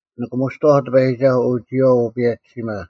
ᓂᑭᒧᔅᑐᐛᐧᒄ ᑎᐸᔨᒋᒐᓱᐤ, ᐅ ᒋᔨᐛᐤ ᐅ ᐸᔭᒋᓯᒪ,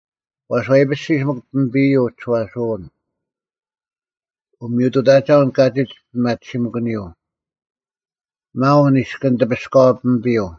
ᐛᔅ ᐛᐃᐱᔅᒋᔅ ᒥᒄ ᐱᒥᐱᔪᐤ ᐅᒋᔄᓱᐅᓐ; ᐅᒥᔪᑐᑕᒐᐅᓐ ᑲᒋᒡ ᐱᒪᑎᓯᐅᓂᔪᐤ: ᒪᐅᓐ ᐃᔅᑭᓐ ᑎᐱᔅᑲᐛ ᐱᒥᐱᔪᐤ,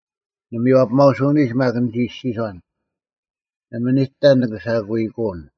ᓂᒥᔽᐱᒪᐅᓱᐅᓂᒡ ᒪᒃ ᓂᒋ ᐃᔅᒋᔄᓐ, “ᓇᒪ ᓂᑕ ᓂᑭ ᓴᑯᐃᑯᓐ᙮”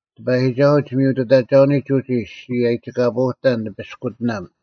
ᑎᐸᔨᒋᒐᓱᐤ, ᒋᒥᔪᑐᑕᒐᐅᓂᒡ ᐅᒋ ᔅᒋ ᐊᔨᒋᑲᐳᐅᑕᓐ ᓂᐱᔅᑯᑎᓇᒻ: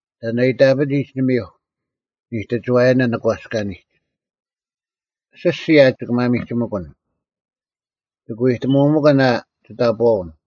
“ᑕᓐ ᐊ ᐃᑕᐱᑎᒡ ᓂᒥᐧᒄ, ᓂᑎᒋᐛᔭᓇ ᓂᒂᔅᑲᓂᒡ? ᐊᓯᔅᒋᔾ ᐊ ᒋᑭ ᒪᒥᒋᒥᑯᓐ? ᒋᑭ ᐎᑕᒧᒥᑭᓐ ᐊ ᒋᑕᑈᐅᓐ?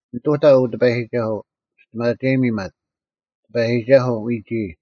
ᓂᑐᑕ, ᐅ ᑎᐸᔨᒋᒐᓱᐤ, ᒋᔅᑎᒪᒐᔨᒥ ᒪᒃ: ᑎᐸᔨᒋᒐᓱᐤ, ᐎᒋᐃ᙮”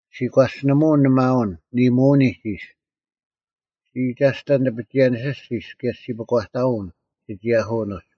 ᔅᒋ ᒂᔅᒋᓂᒧᐅᓐ ᓂ ᒪᐅᓐ ᓂᒧᐅᓂᒡ ᐃᔅ: ᔅᒋ ᐃᒐᔅᑕᓐ ᓂᐱᒋᐅᔭᓇᒋᓂᔅᒋᔅ, ᑭᔭ ᔅᒋ ᐱᒂᑕᐅᓐ ᓯᒋᔭᓯᐅᓐ ᐅᒡ;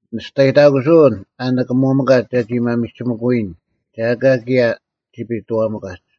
ᓂᒋᔅᑕᔨᑕᑯᓱᐅᓐ ᐊ ᓂᑭᒧᒥᑲᒡ ᒐᒋ ᒪᒥᒋᒥᑯᔨᓐ, ᒐ ᐊᑲ ᑭᔭ ᒋᐱᑐᐛᒥᑲᒡ᙮